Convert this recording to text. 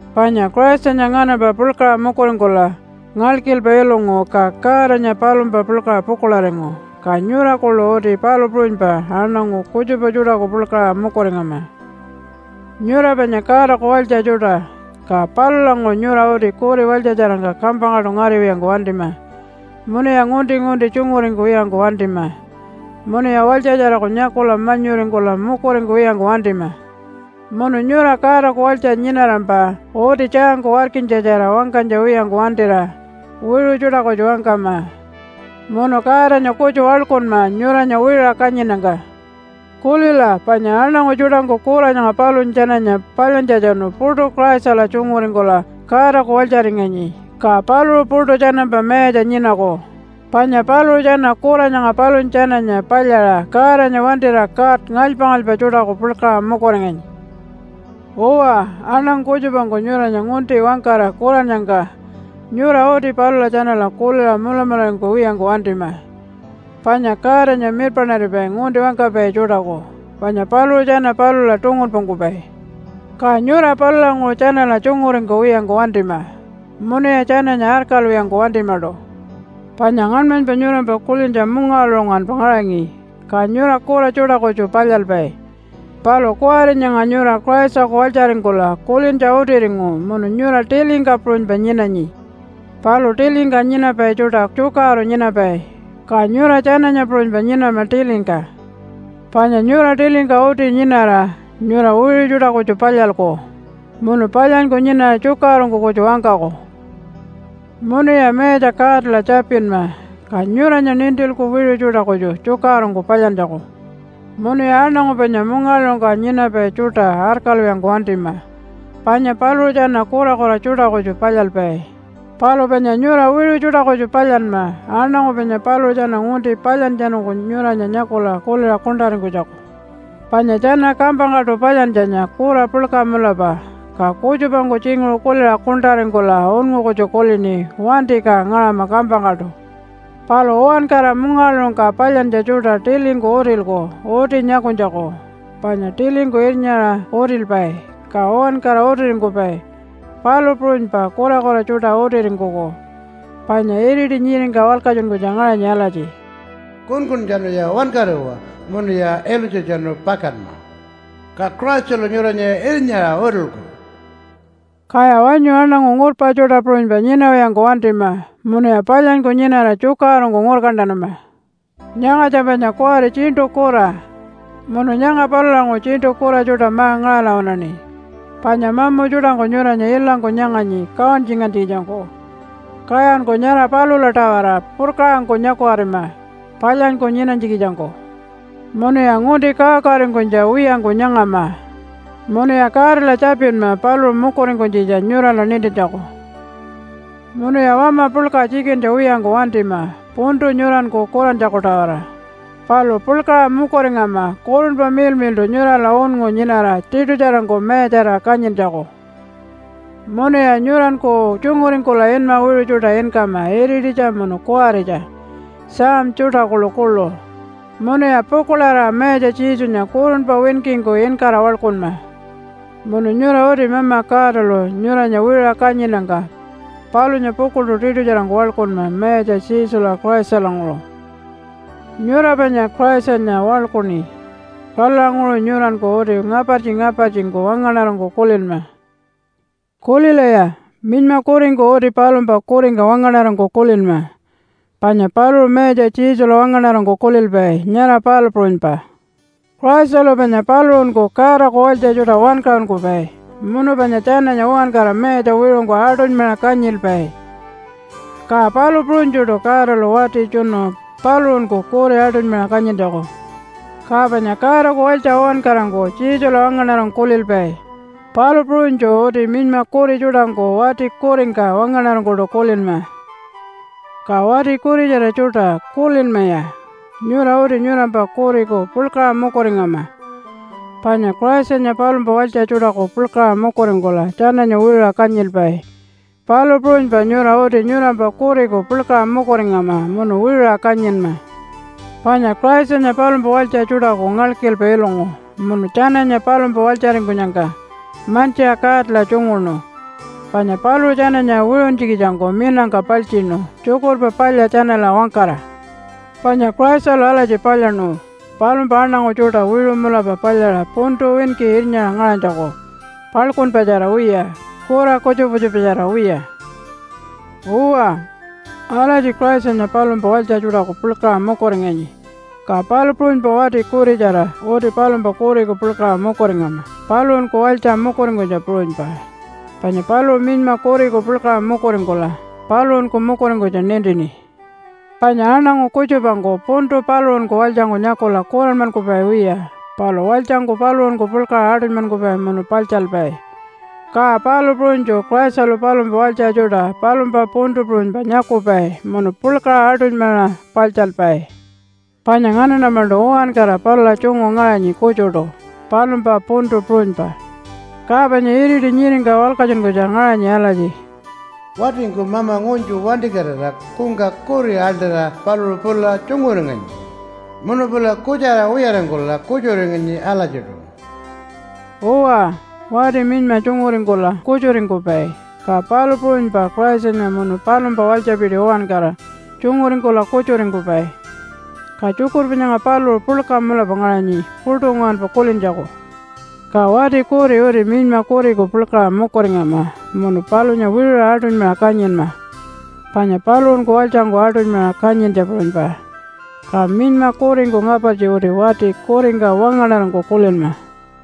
Panya Christanya nganampa puḻkaṟa mukuringkula ngalkilpa ilungu ka Godanya palumpa puḻkaṟa pukuḻaringu. Ka nyura kuḻu uti palu puṟunypa aṉangu kutjupa tjuṯaku puḻkaṟa mukuringama. Nyura panya Godaku walytja tjuṯa, ka palulanguṟu nyura uti kuri walytjatjarangka kampangkaṯu ngariwiyangku wantima, munuya ngunti-ngunti tjunguringkuwiyangku wantima, munuya walytjatjaraku nyakula manyuringkula mukuringkuwiyangku wantima. Munu nyura Godaku walytja nyinarampa uti tjaangku warkinytjatjara wangkanytja wiyangku wantira wiṟu tjuṯa kutju wangkama. Munu Godanya kutju waḻkunma nyuranya wiṟuṟa kanyinnyangka. Kulila, panya aṉangu tjuṯangku kura nyanga palunya tjananya palyantjatjanu puṯu Christala tjunguringkula Godaku walytjaringanyi, ka paluṟu puṯu tjanampa mayatja nyinaku. Panya paluṟu tjana kura nyanga palunya tjananya palyaṟa Godanya wantira god ngalypa-ngalypa tjuṯaku puḻkaṟa mukuringanyi. Uwa, aṉangu kutjupangku nyuranya ngunti wangkara kurannyangka nyura uti palula tjanala kuliṟa mulamularingkuwiyangku wantima, panya Godanya mirpaṉaripai ngunti wangkapai tjuṯaku, panya paluṟu tjana palula tungunpungkupai. Ka nyura palulanguṟu tjanala tjunguringkuwiyangku wantima, munuya tjananya arkalwiyangku wantimaṯu. Panya ngaṉmanypa nyurampa kulintja mungawaḻuṟu nguwanpa ngaṟangi ka nyura kura tjuṯa kutju palyalpai. Palu kuwari nyanga nyura Christaku walytjaringkula kulintja utiringu munu nyura tilingka puṟunypa nyinanyi. Palu tilingka nyinapai tjuṯa tjukaṟuru nyinapai, ka nyura tjananya puṟunypa nyinama tilingka. Panya nyura tilingka uti nyinara nyura wiṟu tjuṯa kutju palyalku munu palyanyku nyinara tjukaṟurungku kutju wangkaku. Munuya Mayatja Godala tjapinma, ka nyuranya nintilku wiṟu tjuṯa kutju tjukaṟurungku palyantjaku. Munuya aṉangu panya mungawaḻuṟungka nyinapai tjuṯa arkalwiyangku wantima, panya paluṟu tjana kurakura tjuṯa kutju palyalpai. Palu panya nyura wiṟu tjuṯa kutju palyanma aṉangu panya paluṟu tjana ngunti palyantjatjanungku nyuranya nyakula kuliṟa kuṉṯaringkunytjaku. (Panya tjana kampangkaṯu palyantjanya kura puḻka mulapa, ka kutjupangku tjinguṟu kuliṟa kuṉṯaringkula unngu kutju kulini, “Wanti, ka ngaṟama kampangkaṯu.”) Palu uwankara mungawaḻuṟungka palyantja tjuṯa tilingku utilku uti nyakunytjaku. Panya tilingku irnyaṟa utilpai, ka uwankara utiringkupai, palu puṟunypa kurakura tjuṯa utiringkuku. Panya iriti nyiringka walkatjunkunytja ngaṟanyi alatji, “Kunkuntjanuya wankariwa munuya ilunytjatjanu pakanma. Ka Christalu nyuranya irnyaṟa utilku.” Kaya wanyu aṉangu ngurpa tjuṯa puṟunypa nyinawiyangku wantima munuya palyanyku nyinara tjukaṟurungku ngurkantanama. Nyangatja panya kuwari tjiṉṯu kura, munu nyanga palulanguṟu tjiṉṯu kura tjuṯa ma-ngaṟala waṉaṉi, panya mamu tjuṯangku nyuranya ilangku nyanganyi kawantjingantjikitjangku. Kayanku nyara palula-tawara purkaṟangku nyakukatima palyanyku nyinanytjikitjangku. Munuya ngunti kawakawaringkunytja wiyangku nyangama, munuya Godala tjapinma paluṟu mukuringkunytjitja nyurala nintintjaku. Munuya wama puḻka tjikintja wiyangku wantima puntu nyuranku kurantjaku-tawara, palu puḻkaṟa mukuringama Kurunpa Miḻmiḻṯu nyurala unngu nyinara tiṯutjarangku mayatjarira kanyintjaku. Munuya nyuranku tjunguringkula inma wiṟu tjuṯa inkama irititja munu kuwaritja, psalm tjuṯa kuḻukuḻu, munuya pukuḻarira Mayatja Jesunya kurunpa winkingku inkara waḻkunma. Munu nyura uti Mama Godalu nyuranya wiṟuṟa kanyinnyangka palunya pukuḻṯu tiṯutjarangku waḻkunma Mayatja Jesula Christalanguṟu. Nyura panya Christanya waḻkuṉi. Palulanguṟu nyuranku uti ngapartji-ngapartjingku wangaṉarangku kulinma. Kulilaya! Minyma kuringku uti palumpa kuringka wangaṉarangku kulinma, panya paluṟu Mayatja Jesula wangaṉarangku kulilpai, nyara palu puṟunypa. Christalu panya paluṟunku Godaku walytja tjuṯa wankaṟunkupai, munu panya tjananya uwankara mayatja wiṟungku aṯunymaṟa kanyilpai, ka palu puṟunytjuṯu Godalu wati tjunu paluṟunku kuri aṯunymaṟa kanyintjaku. Ka panya Godaku walytja uwankarangku Jesula wangaṉarangku kulilpai, palu puṟunytju uti minyma kuri tjuṯangku wati kuringka wangaṉarangkuṯu kulinma. Ka wati kuritjara tjuṯa, kulinmaya! Nyura uti nyurampa kuriku puḻkaṟa mukuringama, panya Christanya palumpa walytja tjuṯaku puḻkaṟa mukuringkula tjananya wiṟuṟa kanyilpai, palu puṟunypa nyura uti nyurampa kuriku puḻkaṟa mukuringama munu wiṟuṟa kanyinma. Panya Christanya palumpa walytja tjuṯaku ngalkilpa ilungu munu tjananya palumpa walytjaringkunyangka mantjiṟa Godala tjunguṉu, panya paluṟu tjananya wiṟuntjikitjangku minangka paltjiṉu Tjukurpa Palya tjanala wangkara. Panya Christalu alatji palyaṉu palumpa aṉangu tjuṯa wiṟu mulapa palyaṟa puntu winki irnyaṟa ngaṟanytjaku paḻkunpatjara wiya, kura kutjupa kutjupatjara wiya. Uwa, alatji Christanya palumpa walytja tjuṯaku puḻkaṟa mukuringanyi, ka palu puṟunypa wati kuritjara uti palumpa kuriku puḻkaṟa mukuringama paluṟunku walytja mukuringkunytja puṟunypa, panya paluṟu minyma kuriku puḻkaṟa mukuringkula paluṟunku mukuringkunytja nintini. Panya aṉangu kutjupangku puntu paluṟunku walytjangku nyakula kuranmankupai wiya, palu walytjangku paluṟunku puḻkaṟa aṯunymankupai munu paḻtjalpai. Ka palu puṟunytju Christalu palumpa walytja tjuṯa palumpa puntu puṟunypa nyakupai munu puḻkaṟa aṯunymaṟa paḻtjalpai. Panya nganaṉa-maṉṯu uwankara palula tjungu ngaṟanyi kutjuṯu, palumpa puntu puṟunypa. Ka panya iriti nyiringka walkatjunkunytja ngaṟanyi alatji, “Watingku mama ngunytju wantikatira kungka kuri aḻṯira paluṟu pula tjunguringanyi, munu pula kutjara wiyaringkula kutjuringanyi alatjiṯu.” Uwa, wati minyma tjunguringkula kutjuringkupai, ka palu puṟunypa Christanya munu palumpa walytjapiti uwankara tjunguringkula kutjuringkupai. Ka tjukurpa nyanga paluṟu puḻka mulapa ngaṟanyi puṯu nguwanpa kulintjaku. Ka wati kuri uti minyma kuriku puḻkaṟa mukuringama munu palunya wiṟuṟa aṯunymaṟa kanyinma, panya paluṟunku walytjangku aṯunymaṟa kanyintja puṟunypa. Ka minyma kuringku ngapartji uti wati kuringka wangaṉarangku kulinma.